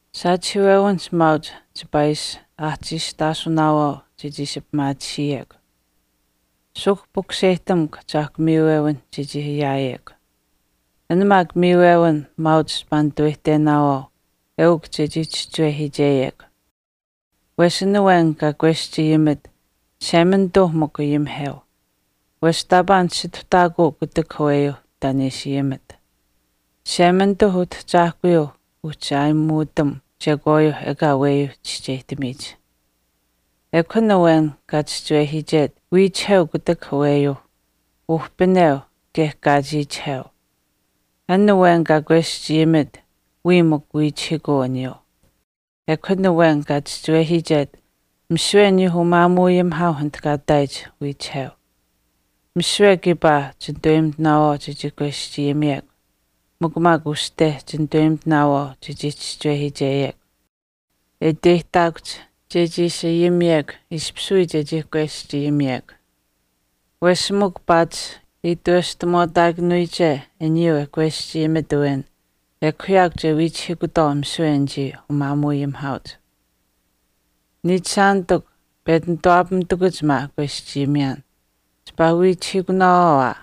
Saachihiiwewinihch maauch chipaa ishi aahchiistaasunaawaau chechii ishi pimaatisiyekw. Suuhk pukuseyihtamukw Ahchaahkw miiwewinh chechii ayaayekw. An maak miiwewin maauch chipaa nitaweyihtenaawaau eukw chechii chischiwehiicheyekw. Wesh an awen kaa kweschayimit Chishemanituuh mikw ayimiheu, wesh taapaa nisituhtaakuu kutak aweyuuh taan e ishi ayimit. Chishemanituuh Utahchaahkuyuuh uhchi aayimuutam chekwaayuuh ekaa aweyuuh chischeyihtamiyich. Ekw an awen kaa chischiwehiichet wiichiheu kutak aweyuuh, uhpineu kaye kaachiichiheu. An awen kaa kweschayimit wiya mikw wiichihiikuu aniyuu. Ekw an awen kaa chischiwehiichet misiwe aniyuuh umaamuuayimihaauh anit kaa ihtaayich wiichiheu. Misiwe kiipaa chinitaweyimitinaawaau chechii kweschayimiyekw. Mikw maak uste chinitaweyimitinaawaau chechii chischiwehiicheyekw. Eukw uu uste e iteyihtaakuhch chechii ishi ayimiyekw ishpish wii chechii kweschayimiyekw. Wesh mikw paatish itweshtamuwaataakanuyiche aniyuu e kweschayimit awen ekw yaakw che wiichihiikutwaau misiwe anichii umaamuuayimihaauch. Niichishaanitikw, pechi nituwaapamitakuch maa e kweschayimiyaan, chipaa wiichihiikunaawaau aa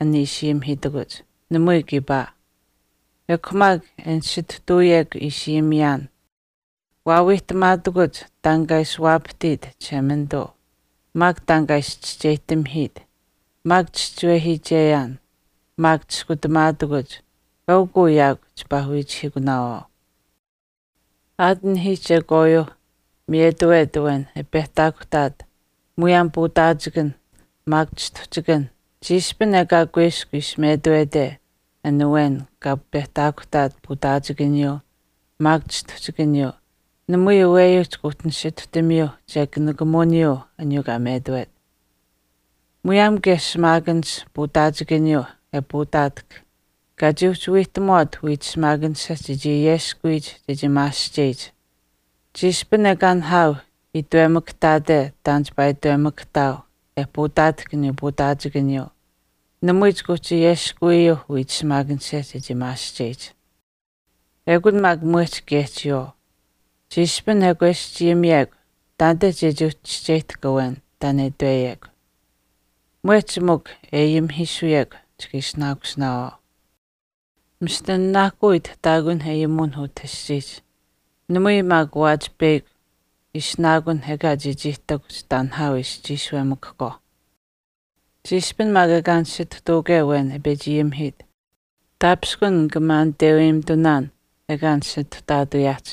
an ishi ayimihiitakuch. Namui kiipaa. Ekw maak e nisituhtuuyekw ishi ayimiyaan, waawiihtamaatakuch taan kaa ishi waapahtiit Chishemanituu, maak taan kaa ishi chischeyihtamihiit, maak chischiwehiicheyaan, maak chiskutamaatakuch eukw uu yaakw chipaa wiichihiikunaawaau. Aat anihiih chekwaayuuh miyetawet awen e pehtaakuhtaat muyaam puutaachikan maak chistuhchikan chiishpin ekaa kuiskw ishi metuwete an awen kaa pehtaakuhtaat puutaachikaniyuu maak chistuhchikaniyuu namui aweyuuh chika uhchi nisituhtamiyuu chekw nikamuwiniyuu aniyuu kaa metuwet. Muyaam kaye shimaakanish puutaachikaniyuu e puutaatahk kaa chii uhchi wiihtamuwaat wiich shimaakanisha chechii ayeskuwiyich chechii maasihcheyich chiishpin ekaa nihaau itwemakahtaate taan chipaa itwemakahtaau e puutaatahk aniyuu puutaachikaniyuu namui chika uhchi ayeskuwiyuuh wiich shimaakanisha chechii maasihcheyich Ekun maak mwehch kaye chiyawaau. Chiishpin e kweschayimiyekw taanite chechii uhchi chischeyihtahk awen taan e itweyekw. Mwehch mikw e ayimihiisuyekw chika ishinaakusinaawaau. Mista nanaahkuu itihtaakunh ayimuwinh utah aschiihch. Namui maak waachi peyakw ishinaakunh ekaa chechii ihtakuhch taan nihaau e ishi chiishuwemakahkwaauh. Chiishpin maak ekaa nisituhtuuke awen e pechi ayimihiit, taapishkun nika maaniteuweyimitunaan ekaa nisituhtaatuyaahch.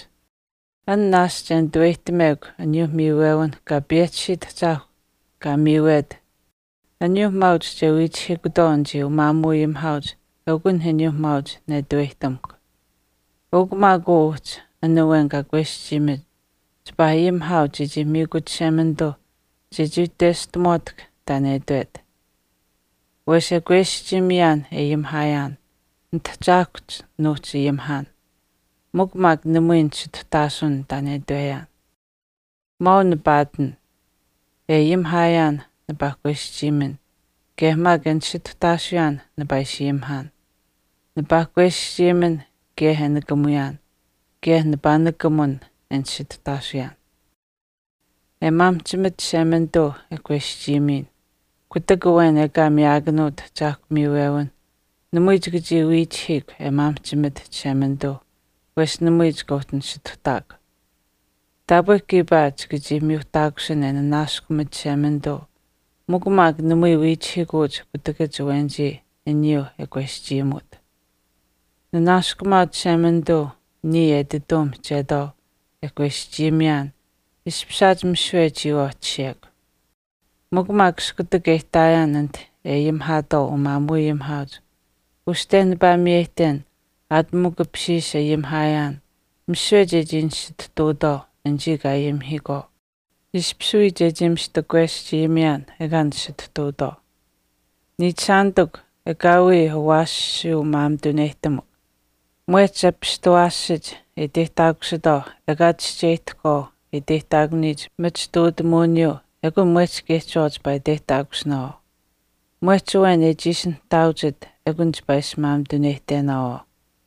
An naashch e nituweyihtamekw aniyuuh miiwewinh Kaa payehchisiit Ahchaahkw kaa miiyawet aniyuuh maauch che wiichihiikutwaau umaamuuayimihaauch eukunh aniyuuh maauch nituweyihtamuhkw. Eukw maak uu uhchi an awen kaa kweschayimit chipaa ayimihaau chechii miikut Chishemanituuh chechii itweshtamuwaatahk taan e itwet. Wesh e kweschayimiyaan e ayimihaayaan, nitahchaahkuhch nuuhchi ayimihaan mikw maak namui nisituhtaasuun taan e itweyaan. Maau nipaa ihtin. E ayimihaayaan nipaa kweschayimin kaye maak e nisituhtaasuyaan nipaa ishi ayimihaan. Nipaa kweschayimin kaye e nikamuyaan kaye nipaa nikamun e nisituhtaasiyaan. E maamihchimat Chishemanituu e kweschayimiyin, kutak awen ekaa eshkw uhchi miyaakanuut ahchaahkuu miiwewinh namui chika chii wiichihiikw e maamihchimat Chishemanituuh wesh namui chika uhchi nisituhtaakw. Taapwe kiipaa chika chii miyuuhtaakusin e nanaaskumat Chishemanituu mikw maak namui wiichihiikuuch kutakach awenich aniyuu e kweschayimuut. Ninanaaskumaau Chishemanituu niya etituu mihchetwaau e kweschayimiyaan ishpishaat misiwe chiyawaau e tashiyekw. Mikw maak iskutak e ihtaayaan anite e ayimihaatwaau umaamuuayimihaauch uste nipaa miyeyihten aat mikw apishiish ayimiyaan misiwe chechii nisituhtuutwaau anichii kaa ayimihiikwaau ishpish wii chechii mista kweschayimiyaan ekaa nisituhtautwaau. Niichishaanitikw, ekaawii awaashiyuu maamituneyihtamukw. Mwehch apishtawaashach e iteyihtaakusitwaau ekaa chischeyihtahkwaau e iteyihtaakuniyich machituutamuwiniyuu ekun mwehch kaye chiyawaau chipaa iteyihtaakusinaawaau. Mwehch awen shaash e chiishi nihtaauchit ekun chipaa ishi maamituneyihtenaawaau.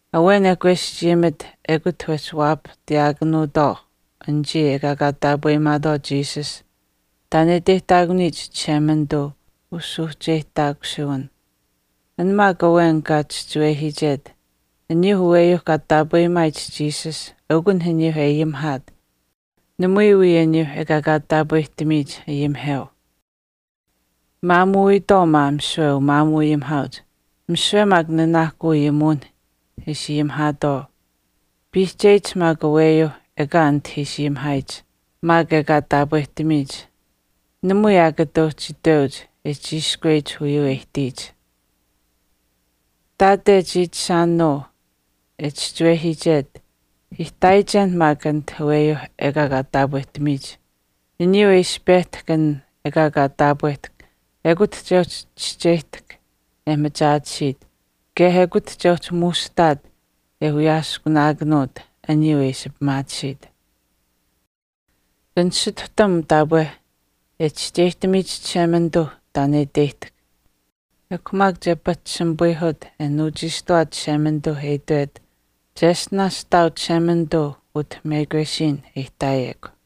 Awen e kweschayimit ekut wehchi waapahtiyaakanuutwaau anichii ekaa kaa taapweyimaatwaau Jesus taan e iteyihtaakuniyich Chishemanituu usuuhcheyihtaakusuwin. An maak awen kaa chischiwehiichet aniyuuh aweyuu kaa taapweyimaayich Jesus eukunh aniyuu e ayimihaat namui wii aniyuu ekaa kaa taapwehtamiyich ayimiheu. Maamuuwiitwaau maa misiwe umaamuuayimihaauch misiwe maak nanaahkuu ishi ayimitwaau aniyuu e ayimihaatwaau, piihcheyich maak aweyuuh ekaa anite ishi ayimihaayich maak ekaa taapwehtamiyich, namui aa kata uhchi itweyuuh e chiishkweyich uyuu e ihtiyich. Ihtaate chiichishaanuu e chischiwehiichet ihtaayichen maak anit aweyuuh ekaa taapwehtamiyich, aniyuu e ishi pehtahk an ekaa kaa taapwehtahk ekut che uhchi che chischeyihtahk e machaatisiit kaye ekut che uhchi muushihtaat e wiyaaskunaakanuut aniyuu e ishi pimaatisiit. Chika nisituhtam taapwe e chischeyihtamiyich Chishemanituuh taan e iteyihtahk. Ekw maak che pahchishimipayihut e nuuchiishtuwaat Chishemanituu e itwet, “Cheshtinaash ihtaau Chishemanituu utah mekwesiin e ihtaayekw.”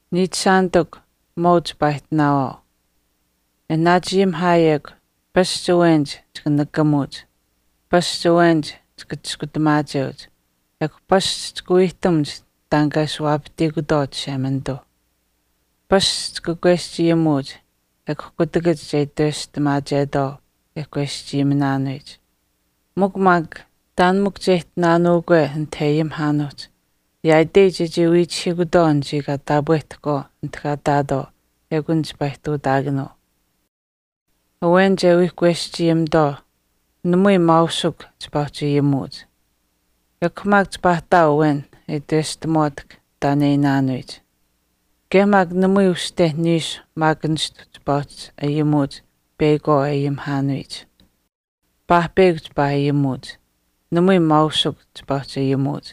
Niichishaanitikw, maau chipaa ihtinaawaau. E naachi ayimihaayekw, pasch awenich chika nikamuuch, pasch awenich chika Chiskutamaacheuch, ekw pasch chika wiihtamuch taan kaa ishi waapahtiikutwaau Chishemanituuh. Pasch chika kweschayimuuch, ekw kutakach che itweshtamaachetwaau e kweschayiminaanuyich. Mikw maak taan mikw che ihtinaanuukwe anite e ayimihaanuuhch yaaitei chechii wiichihiikutwaau anichii kaa taapwehtahkwaau anit kaa ihtaatwaau ekun chipaa ihtuutaakanuu. Awenich e wii kweschayimitwaau, namui maausuk chipaa uhchi ayimuuch. Ekw maak chipaa ihtaau awen e itweshtamuwaatahk taan e iinaanuyich. Kaye maak namui uste niishu maak nistu chipaa uhchi ayimuuch peyakwaau e ayimihaanuyich. Paahpeyakw chipaa ayimuuch. Namui maausukw chipaa uhchi ayimuuch.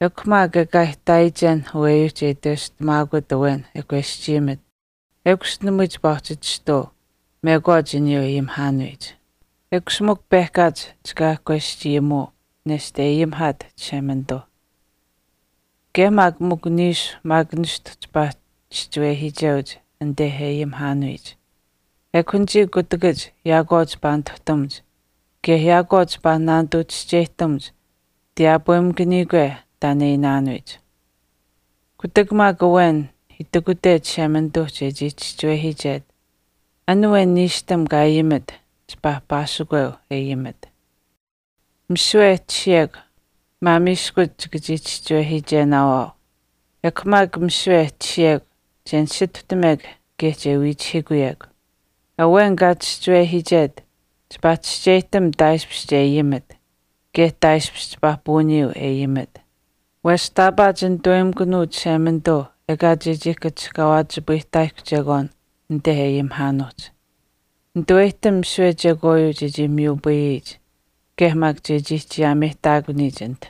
Ekw maak ekaa ihtaayichen aweyuuh che itweshtamaakut awen e kweschayimit ekush namui chipaa uhchi chistuu mekwaach aniyuu e ayimihaanuyich. Ekush mikw pehkaach chika kweschayimuu nesht e ayimihaat Chishemanituuh. Kaye maak mikw niishu maak nishtu awenichii chipaa chischiwehiicheuch anite e ayimihaanuyich. Ekw anichii kutakach yaakwaau chipaa nituhtamuch kaye yaakwaau chipaa naanituu chischeyihtamuch tiyaapwemakaniyikwe taan e iinaanuyich. Kutak maak awen itikute Chishemanituuh chechii chischiwehiichet, an awen niishtam kaa ayimit chipaa paasikweu e ayimit. Misiwe e tashiyekw maamiiskuch chika chii chischiwehiichenaawaau. Ekw maak misiwe e tashiyekw che nisituhtamekw kaye che wiichihiikuyekw. Awen kaa chischiwehiichet chipaa chischeyihtam taaishpish che ayimit kaye taaishpish chipaa puuniyuu e ayimit. Wesh taapaa chinitaweyimikunuu Chishemanituu ekaa chechii kachihkaawaachipayihtaayihkw chekwaan anit e ayimihaanuuhch. Nitaweyihtam misiwe chekwaayuu chechii miyupayiyich kaye maak chechii chiyaameyihtaakuniyich anit.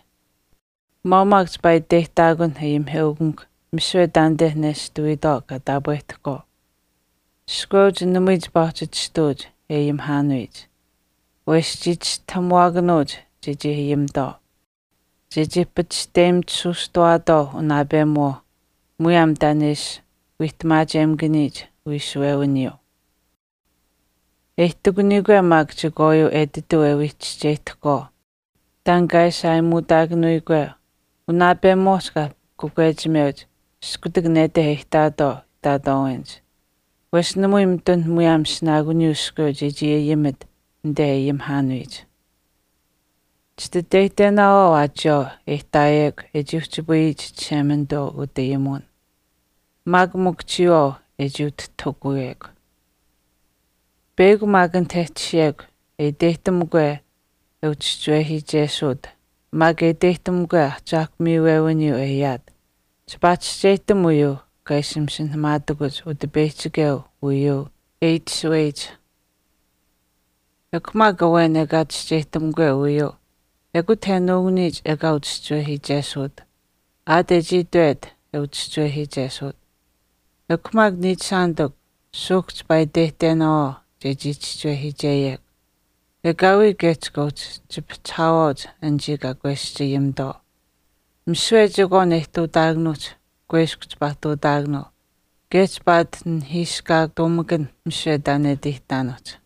Maau maak chipaa iteyihtaakunh ayimiheukamikw misiwe taanite nestuwiitwaau kaa taapwehtahkwaau. Iskweuch namui chipaa uhchi chistuuch e ayimihaanuyich. Wesh chii chistahamuwaakanuuch chechii ayimitwaau, chechii pachishteyimitusuustawaatwaau unaapemuwaauh muyaam taan e ishi wiihtamaachemakaniyich wiishuwewiniyuu. E ihtakuniyikwe maak chekwaayuu etituu e wii chischeyihtahkwaau taan kaa ishi aayimuutaakanuyikwe unaapemuwaau chipaa kakwechimeuch iskutak nete e ihtaatwaau ihtaatwaawenich. Wesh namui mitun muyaam ishinaakuniyuu iskweu chechii ayimit anite e ayimihaanuyich. Chititeyihtenaawaau aa chiyawaau e ihtaayekw e chii uhchipayiyich Chishemanituu utayimuwin, maak mikw chiyawaau e chii utihtahukuyekw. Peyakw maak awen anit e tashiyekw e iteyihtamukwe e uchischiwehiichesuut maak e iteyihtamukwe ahchaahkw miiwewiniyuu e ayaat, chipaa chischeyihtam uyuu kaa ishi masinahamaatakuch Utipeyihchikeuh uyuu e itashuweyich. Ekw maak awen ekaa chischeyihtahke uyuu, ekut e nuukuniyich ekaa uchischiwehiichesuut aat e chii itwet e uchischiwehiichesuut. Ekw maak niichishaanitikw, suuhk chipaa iteyihtenaawaau chechii chischiwehiicheyekw. Ekaawii kaye chika uhchi chipihchihaawaauch anichii kaa kweschayimitwaau. Misiwe chekwaan e ihtuutaakanuuhch kuiskw chipaa ihtuutaakanuu kaye chipaa ati nihiiskaatuumakanh misiwe taan e ati ihtinaanuuhch.